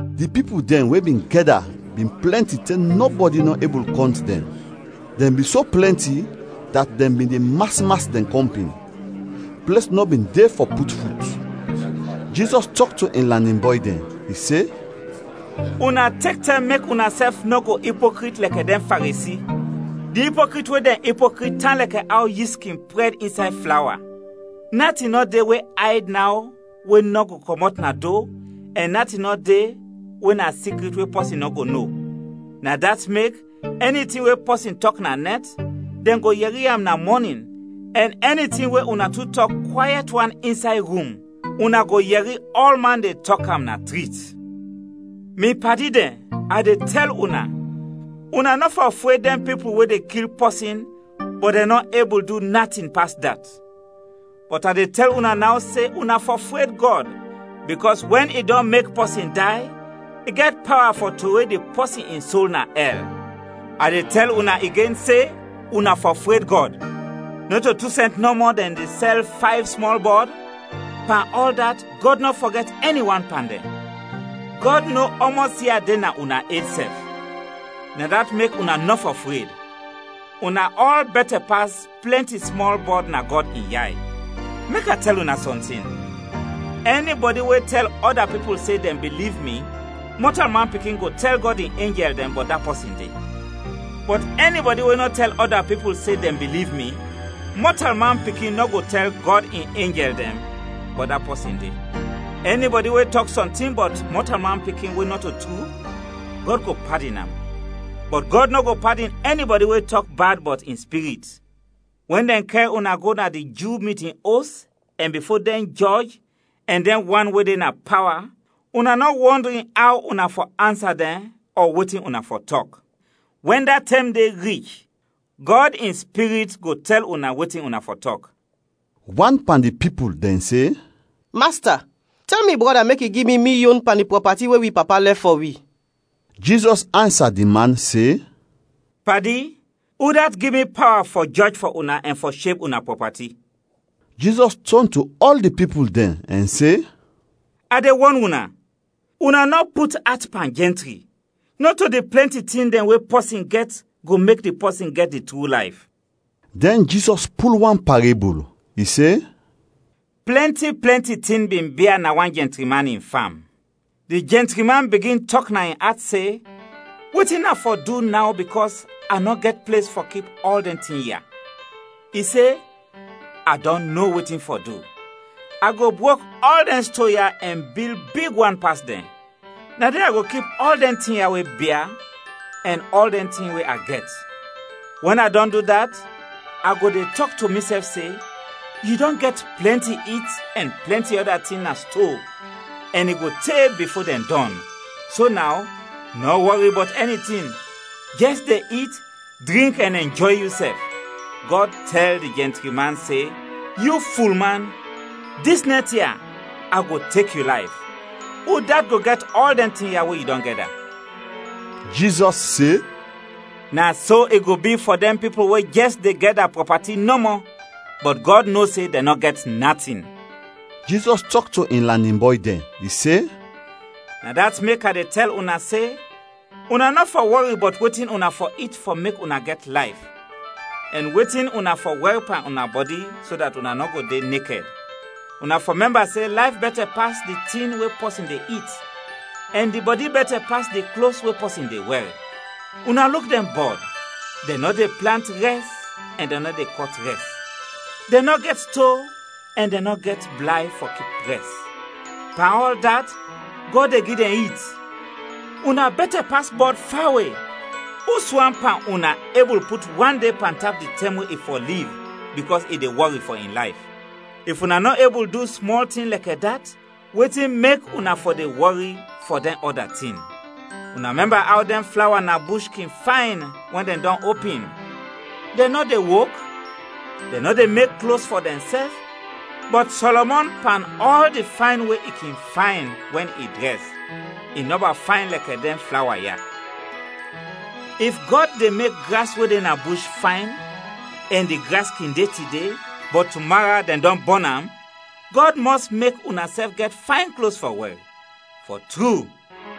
Di pipul dɛn we bin gɛda bin plɛnti te nɔbɔdi nɔ ebul kɔnt dɛn, dɛn bin so plɛnti dat dɛn bin de mas mas dɛn kɔmpin, ples nɔ bin de fɔ put fut. Jizɔs tɔk to in lanin bɔy dɛn, i se, “Una tek tɛm mek unasɛf nɔ go ipokrit lɛkɛ dɛn Faresi; di ipokrit we dɛn ipokrit tan lɛkɛ aw yist kin prɛd insay flawa. Natin nɔ de we ayd naw we nɔ go kɔmɔt na do ɛn natin nɔ de we na sikrit we pɔsin nɔ go no. Na dat mek, ɛni tin we pɔsin tɔk na nɛt, dɛn go yɛri am na mɔnin ɛn ɛni tin we una tu tɔk kwayɛt wan insay rum, una go yɛri ɔlman de tɔk am na trit. “Mi padi dɛn, a de tɛl una, una nɔ fɔ fred dɛn pipul we de kil pɔsin, bɔt dɛn nɔ ebul du natin pas dat. Bɔt a de tɛl una naw se una fɔ fred Gɔd bikɔs wɛn i dɔn mek pɔsin day, i gɛt pawa fɔ trowe di pɔsin in sol na ɛl. A de tɛl una igen se una fɔ fred Gɔd! “Nɔto tu sɛnt nɔmɔ dɛn de sɛl fayv smɔl bɔd? Pan ɔl dat Gɔd nɔ fɔgɛt ɛni wan pan dɛn. Gɔd no ɔmɔs ia de na una ed sɛf. Na dat mek una nɔ fɔ fred; una ɔl bɛtɛ pas plɛnti smɔl bɔd na Gɔd in yay! “Mek a tɛl una sɔntin; ɛnibɔdi we tɛl ɔda pipul se dɛn biliv mi, Mɔtalman Pikin go tɛl Gɔd in enjɛl dɛn bɔt da pɔsin de. Bɔt ɛnibɔdi we nɔ tɛl ɔda pipul se dɛn biliv mi, Mɔtalman Pikin nɔ go tɛl Gɔd in enjɛl dɛn bɔt da pɔsin de. “Ɛnibɔdi we tɔk sɔntin bɔt Mɔtalman Pikin we nɔto tru, Gɔd go padin am, bɔt Gɔd nɔ go padin ɛnibɔdi we tɔk bad bɔt in Spirit. “Wɛn dɛn kɛr una go na di Ju mitin os ɛn bifo dɛn jɔj ɛn dɛn wan we de na pawa, una nɔ wɔndrin aw una fɔ ansa dɛn ɔ wetin una fɔ tɔk. Wɛn da tɛm de rich, Gɔd in Spirit go tɛl una wetin una fɔ tɔk.” Wan pan di pipul dɛn se, “Masta, tɛl mi brɔda mek i gi mi mi yon pan di prɔpati we wi papa lɛf fɔ wi.” Jizɔs ansa di man se, “Padi, udat gi mi pawa fɔ jɔj fɔ una ɛn fɔ sheb una prɔpati?” Jizɔs tɔn to ɔl di pipul dɛn ɛn se, “A de wɔn una, una nɔ put at pan jɛntri. Nɔto di plɛnti tin dɛn we pɔsin gɛt go mek di pɔsin gɛt di tru layf.” Dɛn Jizɔs pul wan parebul. I se: “Plɛnti, plɛnti tin bin bia na wan jɛntri man in fam. Di jɛntri man bigin tɔk na in at se, ‘Wetin a fɔ du naw bikɔs a nɔ gɛt ples fɔ kip ɔl dɛn tin ya?’ I se, ‘A dɔn no wetin fɔ du. A go brok ɔl dɛn sto ya ɛn bil big wan pas dɛn. Na de a go kip ɔl dɛn tin ya we bia ɛn ɔl dɛn tin we a gɛt. Wɛn a dɔn du dat, a go de tɔk to misɛf se, yu dɔn gɛt plɛnti it ɛn plɛnti ɔda tin na sto ɛn i go te bifo dɛn dɔn, so naw, nɔ wɔri bɔt ɛni tin, jɛs de it, drink ɛn ɛnjɔy yusɛf!’ Gɔd tɛl di jɛntri man se, ‘Yu fulman! Dis nɛt ya, a go tek yu layf. Udat go gɛt ɔl dɛn tin ya we yu dɔn gɛda?’” Jizɔs se, “Na so i go bi fɔ dɛn pipul we jɛs de gɛda prɔpati nɔmɔ, bɔt Gɔd no se dɛn nɔ gɛt natin.” Jizɔs tɔk to in lanin bɔy dɛn. I se, “Na dat mek a de tɛl una se, una nɔ fɔ wɔri bɔt wetin una fɔ it fɔ mek una gɛt layf ɛn wetin una fɔ wɛr pan una bɔdi so dat una nɔ go de nekɛd. Una fɔ mɛmba se layf bɛtɛ pas di tin we pɔsin de it ɛn di bɔdi bɛtɛ pas di klos we pɔsin de wɛr. Una luk dɛn bɔd, dɛn nɔ de plant rɛs ɛn dɛn nɔ de kɔt rɛs. Dɛn nɔ gɛt sto ɛn dɛn nɔ gɛt blay fɔ kip rɛs. Pan ɔl dat, Gɔd de gi dɛn it. Una bɛtɛ pas bɔd fawe. Uswan pan una ebul put wan de pantap di tɛm we i fɔ liv bikɔs i de wɔri fɔ in layf? If una nɔ ebul du smɔl tin lɛkɛ dat, wetin mek una fɔ de wɔri fɔ dɛn ɔda tin? Una mɛmba aw dɛn flawa na bush kin fayn wɛn dɛn dɔn opin; dɛn nɔ de wok, dɛn nɔ de mek klos fɔ dɛnsɛf, bɔt Sɔlɔmɔn pan ɔl di fayn we i kin fayn wɛn i drɛs, i nɔba fayn lɛkɛ dɛn flawa ya. If Gɔd de mek gras we de na bush fayn ɛn di gras kin de tide, bɔt tumara dɛn dɔn bɔn am, Gɔd mɔs mek unasɛf gɛt fayn klos fɔ wɛr. Fɔ tru,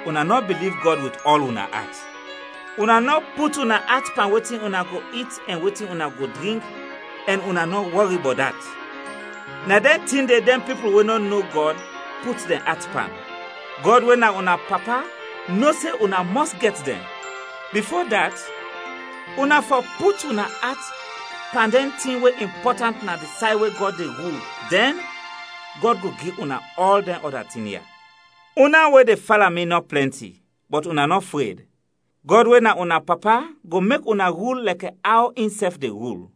una nɔ biliv Gɔd wit ɔl una at! “Una nɔ put una at pan wetin una go it ɛn wetin una go drink, ɛn una nɔ wɔri bɔt dat! Na dɛn tin de dɛn pipul we nɔ no Gɔd put dɛn at pan. Gɔd we na una Papa no se una mɔs gɛt dɛn. Bifo dat, una fɔ put una at pan dɛn tin we impɔtant na di say we Gɔd de rul, dɛn, Gɔd go gi una ɔl dɛn ɔda tin ya. “Una we de fala mi nɔ plɛnti, bɔt una nɔ fred; Gɔd we na una Papa go mek una rul lɛkɛ aw insɛf de rul.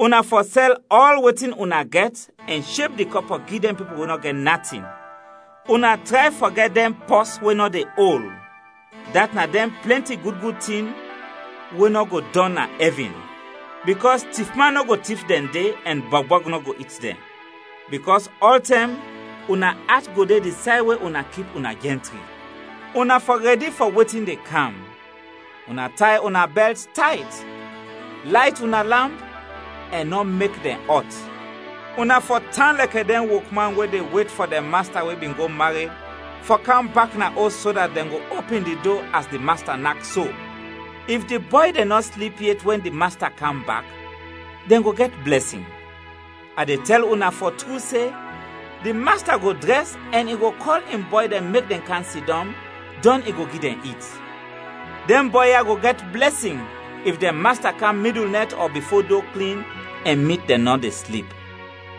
Una fɔ sɛl ɔl wetin una gɛt ɛn sheb di kɔpɔ gi dɛn pipul we nɔ gɛt natin; una tray fɔ gɛt dɛn pɔs we nɔ de ol, dat na dɛn plɛnti gud gud tin we nɔ go dɔn na ɛvin, bikɔs tifman nɔ go tif dɛn de ɛn bɔgbɔg nɔ go it dɛn. Bikɔs ɔltɛm una at go de di say we una kip una jɛntri. “Una fɔ rɛdi fɔ wetin de kam, una tay una bɛlt tayt, layt una lamp, ɛn nɔ mek dɛn ɔt. Una fɔ tan lɛkɛ dɛn wokman we de wet fɔ dɛn masta we bin go mared fɔ kam bak na os so dat dɛn go opin di do as di masta nak so. If di bɔy dɛn nɔ slip yet wɛn dɛn masta kam bak, dɛn go gɛt blɛsin. A de tɛl una fɔ tru se, di masta go drɛs ɛn i go kɔl in bɔy dɛn mek dɛn kam sidɔm, dɔn i go gi dɛn it. Dɛn bɔy ya go gɛt blɛsin if dɛn masta kam midul nɛt ɔ bifo do klin ɛn mit dɛn nɔ de slip.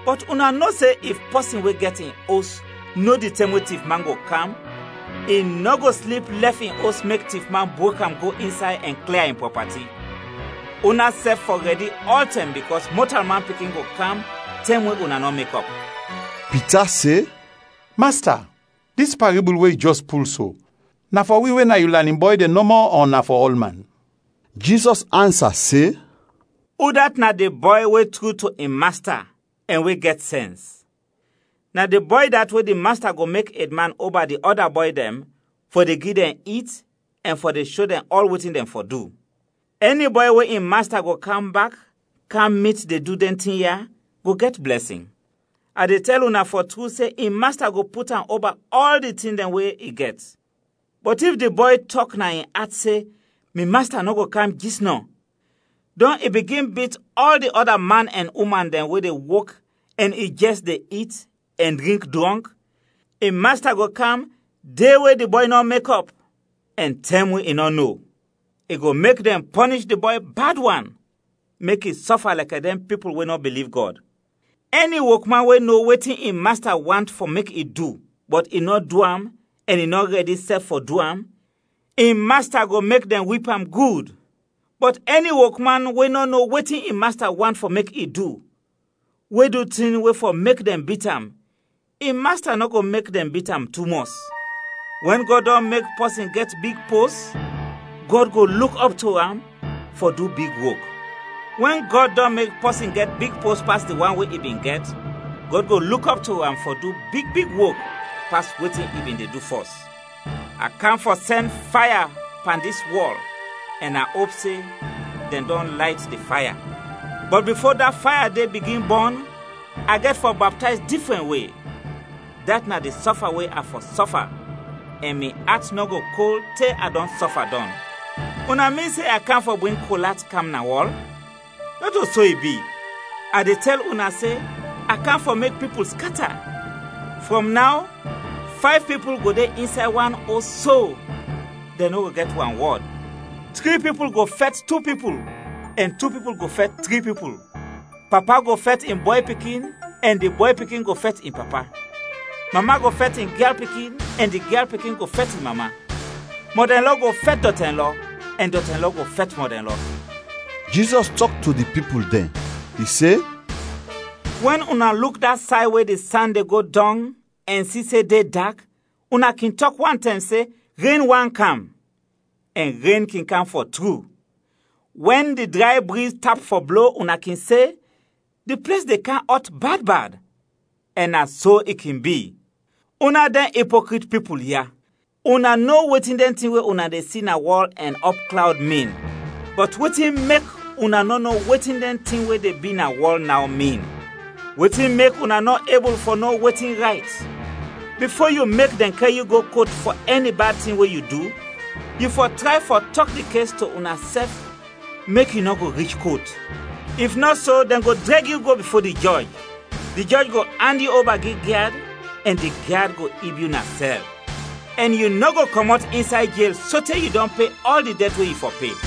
Bɔt una no se if pɔsin we gɛt in os no di tɛm we tifman go kam, i nɔ go slip lɛf in os mek tifman brok am go insay ɛn klia in prɔpati. Unasɛf fɔ rɛdi ɔltɛm bikɔs Mɔtalman Pikin go kam tɛm we una nɔ mekɔp.” Pita se, “Masta, dis parebul we yu jɛs pul so, na fɔ wi we na yu lanin bɔy dɛn nɔmɔ ɔ na fɔ ɔlman?” Jizɔs ansa se, “Udat na di bɔy we tru to in masta ɛn we gɛt sɛns? Na di bɔy dat we di masta go mek edman oba di ɔda bɔy dɛn fɔ de gi dɛn it ɛn fɔ de sho dɛn ɔl wetin dɛn fɔ du. Ɛni bɔy we in masta go kam bak kam mit de du dɛn tin ya go gɛt blɛsin. A de tɛl una fɔ tru se in masta go put am oba ɔl di tin dɛn we i gɛt. Bɔt if di bɔy tɔk na in at se, ‘Mi masta nɔ go kam jisnɔ’ dɔn i bigin bit ɔl di ɔda man ɛn uman dɛn we de wok ɛn i jɛs de it, ɛn drink drɔnk, in masta go kam de we di bɔy nɔ mekɔp ɛn tɛm we i nɔ no. I go mek dɛn pɔnish di bɔy bad wan mek i sɔfa lɛkɛ dɛn pipul we nɔ biliv Gɔd. “Ɛni wokman we no wetin in masta want fɔ mek i du, bɔt i nɔ du am ɛn i nɔ rɛdi sɛf fɔ du am, in masta go mek dɛn wip am gud. Bɔt ɛni wokman we nɔ no wetin in masta want fɔ mek i du, we du tin we fɔ mek dɛn bit am, in masta nɔ go mek dɛn bit am tumɔs. Wɛn Gɔd dɔn mek pɔsin gɛt big pos, Gɔd go luk ɔp to am fɔ du big wok. Wɛn Gɔd dɔn mek pɔsin gɛt big pos pas di wan we i bin gɛt, Gɔd go luk ɔp to am fɔ du big big wok pas wetin i bin de du fɔs. “A kam fɔ sɛn faya pan dis wɔl ɛn a op se dɛn dɔn layt di faya. Bɔt bifo da faya de bigin bɔn, a gɛt fɔ baptayz difrɛn we, dat na di sɔfa we A fɔ sɔfa ɛn mi at nɔ go kol te a dɔn sɔfa dɔn. Una min se a kam fɔ bring kol at kam na wɔl? Nɔto so i bi; a de tɛl una se, a kam fɔ mek pipul skata. Frɔm naw, fayv pipul go de insay wan os so, dɛn nɔ go gɛt wanwɔd. Tri pipul go fɛt tu pipul ɛn tu pipul go fɛt tri pipul. Papa go fɛt in bɔy pikin ɛn di bɔy pikin go fɛt in papa. Mama go fɛt in gyal pikin ɛn di gyal pikin go fɛt in mama. Mɔdɛnlɔ go fɛt dɔtɛnlɔ ɛn dɔtɛnlɔ go fɛt mɔdɛnlɔ.” Jizɔs tɔk to di pipul dɛn. I se, “Wɛn una luk da say we di san de go dɔng ɛn si se de dak, una kin tɔk wantɛm se, ‘Ren want kam!’ ɛn ren kin kam fɔ tru. Wɛn di dray briz tap fɔ blo, una kin se, ‘Di ples de kam ɔt bad bad!’ ɛn na so i kin bi. Una dɛn ipokrit pipul ya, una no wetin dɛn tin we una de si na wɔl ɛn ɔpklawd, min, bɔt wetin mek una nɔ no wetin dɛn tin we de bi na wɔl naw, min? “Wetin mek una nɔ ebul fɔ no wetin rayt? Bifo yu mek dɛn kɛr yu go kot fɔ ɛni bad tin we yu du, yu fɔ tray fɔ tɔk di kes to unasɛf mek yu nɔ go rich kot, if nɔ so, dɛn go drɛg yu go bifo di jɔj, di jɔj go and yu gi di gyad ɛn di gyad go ib yu na sɛl. Ɛn yu nɔ go kɔmɔt insay jel sote yu dɔn pe ɔl di dɛt we yu fɔ pe.”